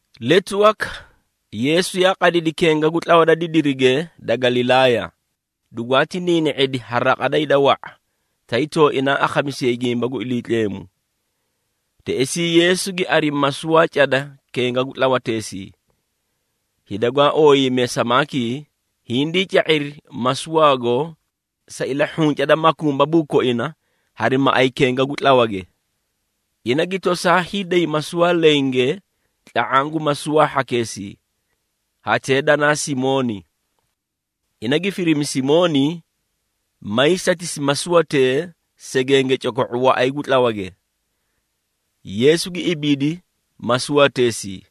Letu waka, Yeesu yaa qadidi kenga gu tlawa da didirige da Galilaaya, dugwaati niini⁄idi ha raqa da hida wa⁄a, tay tooinaa akhamisiyayi gimba gu Iliitleemu. Teꞌesii Yeesu gi arimi masuwaa cada kenga gu tlawateesii. Hida gwaa ooyiiyimee samaakii hindii ca⁄iri masuwaago sa ilahhunca da makumbabuu koina hari maꞌay kenga gu tlawage. Ina gi tosaa hiiday masuwaa lenge tla⁄aã gu masuwaa hhakeesii, hatee danaa Simooni. Ina gi firimi Simooni maay satisi masuwatee segenge coko⁄o waꞌay gu tlawage. Yeesu gi ibiidi masuwateesii,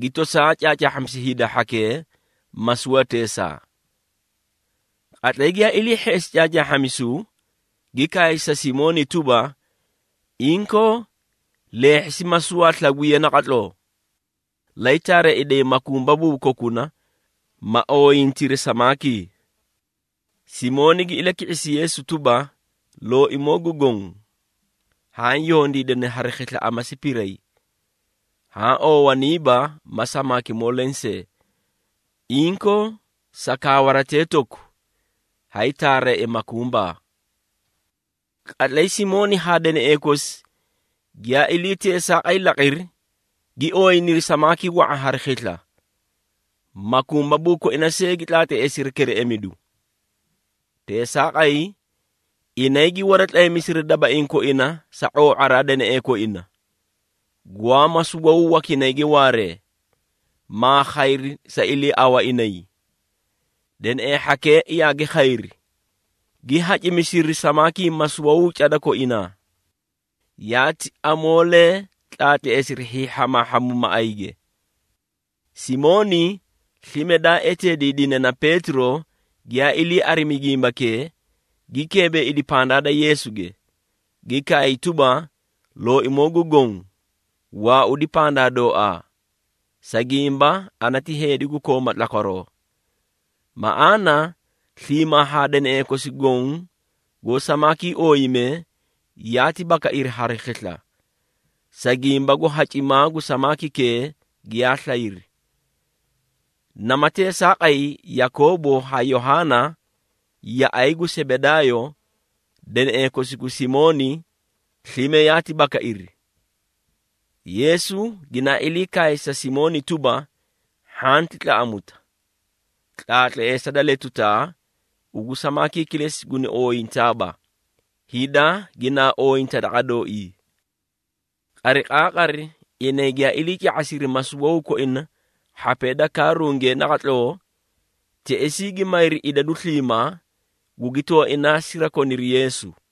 gi tosaa caacaahhamisi hida hhakee masuwateesaa. Qatlay giyaa ilii hheꞌesi caacaahhamisu, gi kaay sa Simooni tuba, “Inkoo, leehhisi masuwaa slagwiya naqatloo, lay taareeꞌeday makumbabuu kokuna, ma ooyintiri samaakii.” Simooni gi ilaki⁄isi Yeesu tuba, “Looimoo gu Goõ, haã yondiidani hari khisla amasi piray, haã oowaniiba ma samaakimoo lensee! Inkoo, sa kaawaratee toku, hay taareea makumbabuu.” Qatlay Simooni haa deneꞌee kosi giyaa ilii teesaaqay laqiri, gi ooyiniri samaakii wa⁄a hari khisla, makumbabuu koina see gi tlaatleesiri kereꞌemidu. Teesaaqay, inay gi waratlaymisiri dabaiĩ koina sa ⁄oo⁄araa da deneꞌee koina, gwaa masuwawuu wakinayge waaree, maa khayri sa iliiawaraa inay. Deneꞌee hhakee yaagi khayri, gi hacimisiri samaakii masuwawuu cada koinaa, yaati amoolee tlaatleesiri hiihhamaahhamu maꞌayge. Simooni slime daa eteediidine na Peetiro giyaa ilii arimi gimbakee, gi keebeeidi pandaa da Yeesuge, gi kaay tuba, “Looimoo gu Goõ, waaudi pandaa dooaa, sa gimba ana ti heedi gu kooma tlakwaroo!” Maꞌaana sliimaa haa deneꞌee kosi goõ goó samaakii ooyimee, yaati bakairi hari khisla, sa gimba gu hacimaa gu samaakikee giyaa slayri. Nama teesaaqay, Yakoobo haa Yohaana yaꞌay gu Sebedaayo, deneꞌee kosi gu Simooni, slime yaati bakairi. Yeesu ginaa ilii kaay sa Simooni tuba, “Hhanti tlaꞌamuta! Tlaatleesa da letutaa, ugu samaakii kilesi guni ooyintaaba, hida ginaa ooyinta daqa dooii.” Qariqaaqari inay giyaa ilii ca⁄asiri masuwawuu koina hhapee da kaarunge naqatloo, teꞌesii gi mayri idadu sliimaa, gugi tooinaa sirakoniri Yeesu.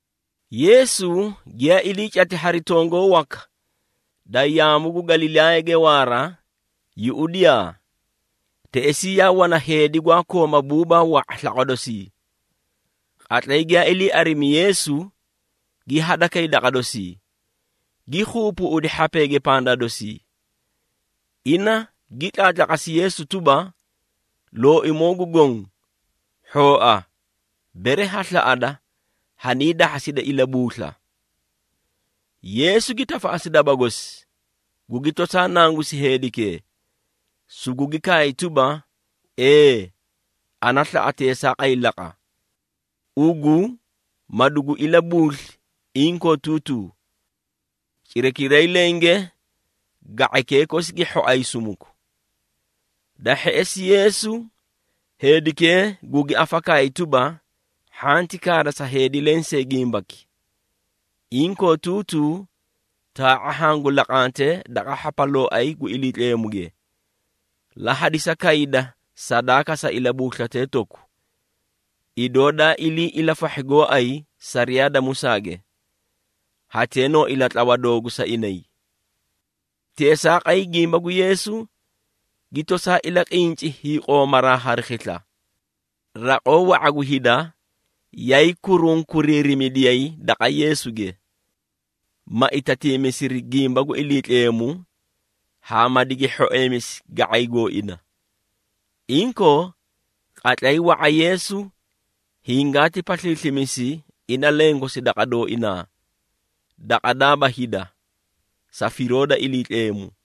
Yeesu giyaa ilii cati hari tongoo waka da yaamu gu Galilaayage waara, yuꞌudiyaa, teꞌesii yaa wana heedi gwaa kooma buubaa wa⁄a slaqwa dosii. Qatlay giyaa ilii arimi Yeesu, gi hadakay daqa dosii, gi keebeeꞌedi hhapeege pandaa dosii. Ina gi tlaatlaqasi Yeesu tuba, “Looimoo gu Goõ, hhooa, bere ha slaꞌada, haniidahhasida ilabuusla!” Yeesu gi tafaꞌasi daba gosi, gugi tosaa nangusi heedikee, sugugi kaay tuba, “Ee, Ana slaꞌa teesaaqay laqa, ugu ma dugu ilabuusli inkootuutuu!” Cirakiray lenge ga⁄aykee kosi gi hhoay sumuku! Da hheꞌesi Yeesu, heedikee gugi afakaayi tuba, “Hhanti kaada sa heedi lensee gimbaki. Inkootuutuu taa⁄a hangu laqante daqa hhapalooay gu Iliitleemuge, la hadisa kayda sadaaka sa ilabuuslatee toku, idoo daa ilii ilafahhi gooay sariyaa da Musaage. Hatee noo ilatlawa doogu sa inay.” Teesaaqay gimba gu Yeesu, gi tosaa ilaqinci hiiqoomaraa hari khisla. Raqoo wa⁄a gu hida yaay kurunkuriirimidiyay daqa Yeesuge, ma itatiimisiri gimba gu Iliitleemu haa ma digi hhoeemisi ga⁄ay gooina. Inkoo, qatlay wa⁄a Yeesu hingaati pasliislimisi ina lenkosi daqa dooinaa, daqa daaba hida, sa firoo da Iliitleemu.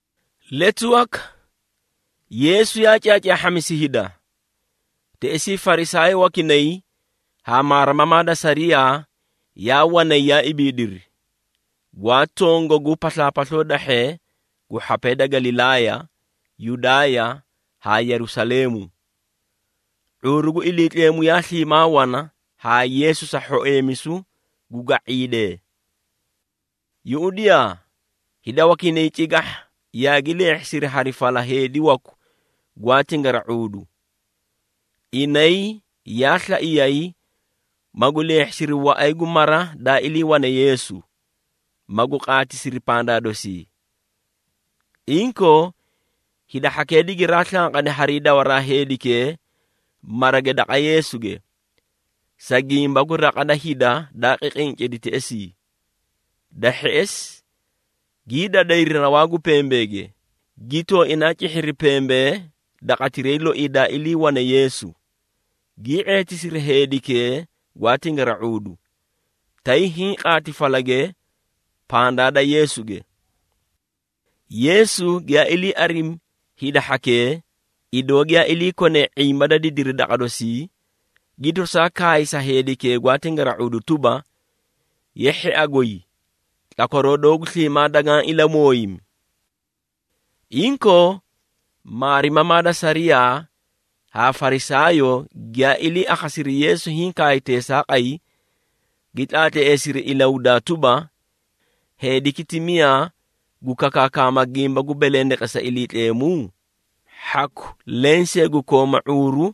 Letu waka, Yeesu yaa caacaahhamisi hida. Teꞌesii Farisaayoo wakinay haa maarimamaa da sariyaa, yaa wanay yaa ibiidiri, gwaa tongagu paslaapasloo dahhee gu hhapee da Galilaaya, Yudaaya haa Yerusaleemu. ⁄uuru gu Iliitleemu yaa sliimaa wana haa Yeesu sa hhoeemisu gu ga⁄iidee. Yuꞌudiyaa, hida wakinay cigahha yaagi leehhisiri hari fala heedi waku gwaa tingara⁄uudu. Inay yaa slaiyay, magu leehhisiri waꞌay gu mara daa iliiwane Yeesu, magu qaatisiri pandaa dosii. Inkoo, hida hhakee digiraa slanqadi hari dawaraa heedikee marage daqa Yeesuge, sa gimba gu raqa da hida daa qiqincidi teꞌesii. Da hheꞌesi gii dadayri rawaa gu pembeege, gi tooinaa cihhiri pembee daqatiray loii daa iliiwane Yeesu, gii ⁄eetisiri heedikee gwaa tingara⁄uudu, tay hiĩ qaati falage pandaa da Yeesuge. Yeesu giyaa ilii arimi hida hhakee, idoo giyaa iliikonee ⁄imba da didiri daqa dosii, gi tosaa kaay sa heedikee gwaa tingara⁄uudu tuba, “Ye hhia goy, tlakwaroo doogu sliimaa dagaã ilamooyimi!” Inkoo, maarimamaa da sariyaa haa Farisaayoo giyaa ilii akhasiri Yeesu hiĩ kaay teesaaqay, gi tlaatleesiri ilahudaa tuba, “Heediki ti miyaa gu kakaakama gimba gu belendeqesa Iliitleemu? Hhaku lensee gu kooma ⁄uuru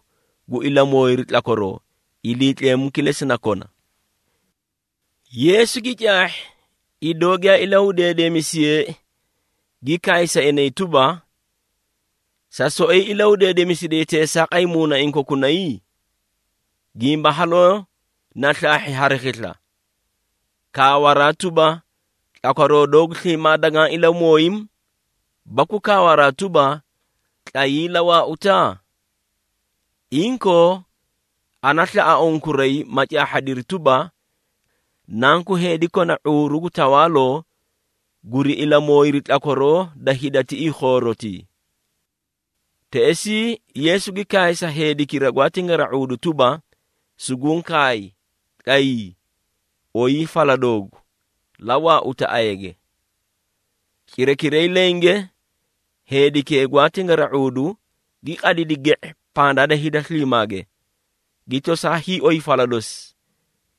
gu ilamooyiru tlakwaroo, Iliitleemu kilesi na kona!” Yeesu gi caahhi idoo giyaa ilahudeedemisiyeei, gi kaay sa inay tuba, “Sa soꞌoyi ilahudeedemisiday teesaaqay muunaiĩ kokunay? Gimba haloo na slaahhi hari khisla, kaawaraa tuba, ‘Tlakwaroo doogu sliimaa dagaã ilamooyimi,’ baku kaawaraa tuba, ‘Tlayii, la waauta?’ Inkoo, ana slaꞌa unkuray, ma caahhadiri tuba, Nanku Heedi kona ⁄uuru gu tawaaloo guri ilamooyiru tlakwaroo da hida tiꞌii khoorotii!” Teꞌesii Yeesu gi kaay sa heedikira gwaa tingara⁄uudu tuba, “Suguũ kaay, tlayii, oyii fala doogu, la waauta ayage!” Cirakiray lenge heedikee gwaa tingara⁄uudu gi qadidi ge⁄e pandaa da hida sliimaage, gi tosaa hiioy fala dosi,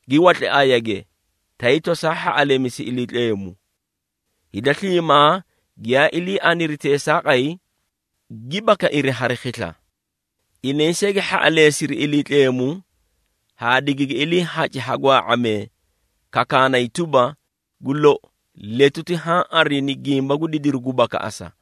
gi watli ayage, tay tosaa hhaꞌaleemisi Iliitleemu. Hida sliimaa giyaa ilii aniri teesaaqay, gi bakairi hari khisla! Inay see gi hhaꞌaleesiri Iliitleemu haa digigi iliihaci ha gwaa⁄amee, kakaanay tuba, “Gu lou, letuti haã arini gimba gu didiru gu bakaꞌasa!”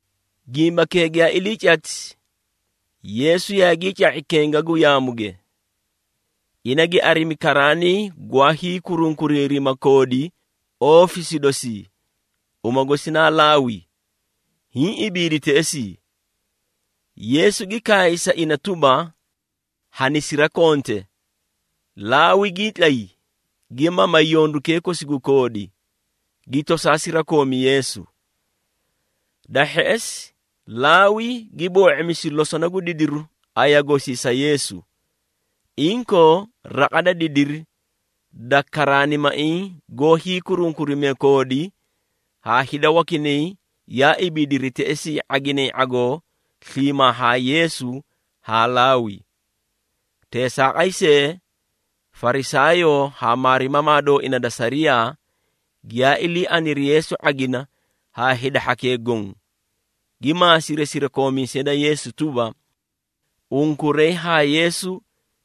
Gimbakee giyaa ilii cati, Yeesu yaagii ca⁄i kenga gu yaamuge. Ina gi arimi karaanii gwaa hiikurunkuriirima koodi oofisi dosii, uma gosi naa Laawi, hiĩ ibiidi teꞌesii. Yeesu gi kaay sa ina tuba, “Hanisirakonte!” Laawi gii tlay, gi mamay yondukee kosi gu koodi, gi tosaa sirakoomi Yeesu. Da hheꞌesi Laawi gi boo⁄imisi losona gu didiru aya gosii sa Yeesu. Inkoo raqa da didiri da karaanimaiĩ goó hiikurunkurimee koodi haa hida wakinay yaa ibiidiri teꞌesii ⁄aginay ⁄agoo sliimaa haa Yeesu haa Laawi. Teesaaqay see, Farisaayoo haa maarimamaa dooina da sariyaa, giyaa ilii aniri Yeesu ⁄agina haa hida hhakee goõ, gi maasiri sirakoomiisee da Yeesu tuba, “Unkuray haa Yeesu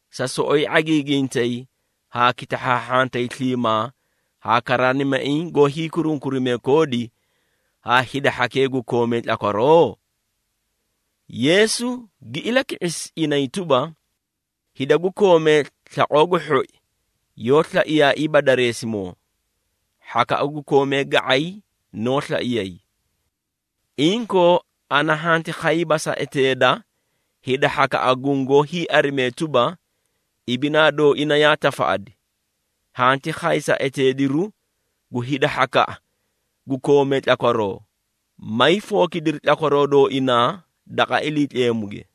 sa soꞌoyi ⁄agiigintay haa kitahhaahhantay sliimaa haa karaanimaiĩ goó hiikurunkurimee koodi haa hida hhakee gu koomee tlakwaroo?” Yeesu gi ilaki⁄isi inay tuba, “Hida gu koomee slaqoo gu hhoi yoó slaiyaaiiba dareesimoo, hhakaꞌa gu koomee ga⁄ay noó slaiyay. Inkoo, ana hanti khayiiba sa eteeda hida hhakaꞌa gungoó hiiarimee tuba, ibinaa dooina yaa tafaꞌadi. Hanti khay sa eteediru gu hida hhakaꞌa gu koomee tlakwaroo, may fookidiri tlakwaroo dooinaa daqa Iliitleemuge.”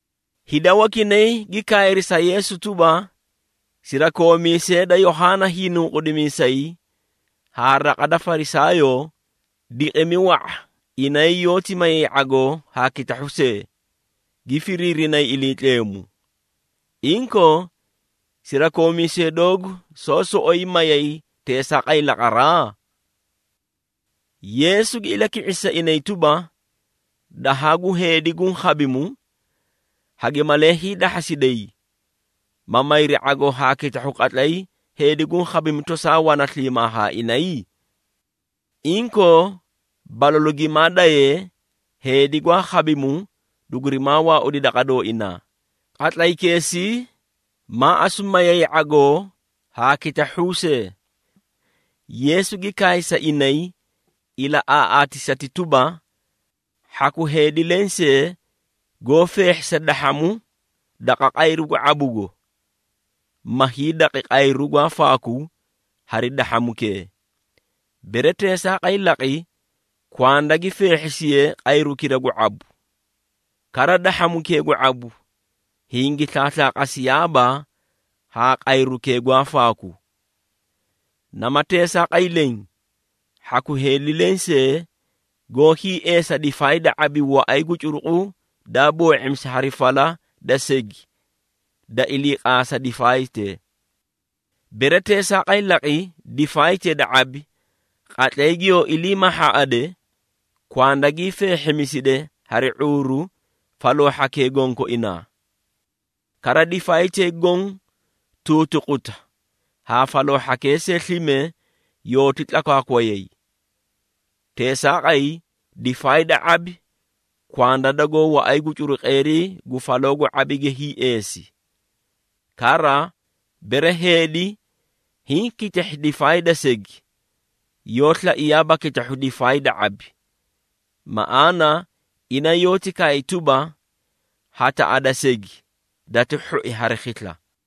Hida wakinay gi kaayri sa Yeesu tuba, “Sirakoomiisee da Yohaana Hiinunqudimiisay haa raqa da Farisaayoo, diqimi wa⁄a inay yoóti mayay ⁄agoo haa kitahhu see, gi firiirinay Iliitleemu. Inkoo, sirakoomiisee doogu soó soꞌoyi mayay teesaaqay laqaraa?” Yeesu gi ilaki⁄isi sa inay tuba, “Dahaa gu heedi guũ khabimu, hagi malee hiidahhasiday, ma mayri ⁄agoo haa kitahhuu qatlay heedi guũ khabimu tosaa wana sliimaa haa inay? Inkoo, balalu gimaa dayee, heedi gwaa khabimu dugurimaa waaudi daqa dooinaa, qatlaykeesii maa asu mayay ⁄agoo haa kitahhuu see.” Yeesu gi kaay sa inay ilaꞌaaꞌaatisati tuba, “Hhaku heedi lensee goó feehhisa dahhamu daqa qayru gu ⁄abugo, ma hiidaqi qayru gwaa faaku hari dahhamukee. Bere teesaaqay laqi, kwanda gi feehhisiye qayrukira gu ⁄abu. Kara dahhamukee gu ⁄abu hingi slaaslaaqasiyaaba haa qayrukee gwaa faaku. Nama teesaaqay leẽ, hhaku heedi lensee goó hiieesa difaay da ⁄abi waꞌay gu curuqu daa boo⁄imisi hari fala da segi da iliiqaasa difaaytee. Bere teesaaqay laqi, difaaytee da ⁄abi, qatlay giyoo ilii mahhaaꞌade, kwanda gii feehhimiside hari ⁄uuru faloo hhakee gonkoinaa. Kara difaaytee goõ tuutuquta haã faloo hhakee see slime yooti tlakwaakwayay. Teesaaqay difaay da ⁄abi kwanda dagoó waꞌay gu curuqeerii gu faloo gu ⁄abige hiieesi. Kara, bere heedi hiĩ kitahhi difaay da segi, yoó slaiyaaba kitahhu difaay da ⁄abi, maꞌaana ina yoóti kaay tuba, ‘Hataꞌa da segi dati hhoi hari khisla!’”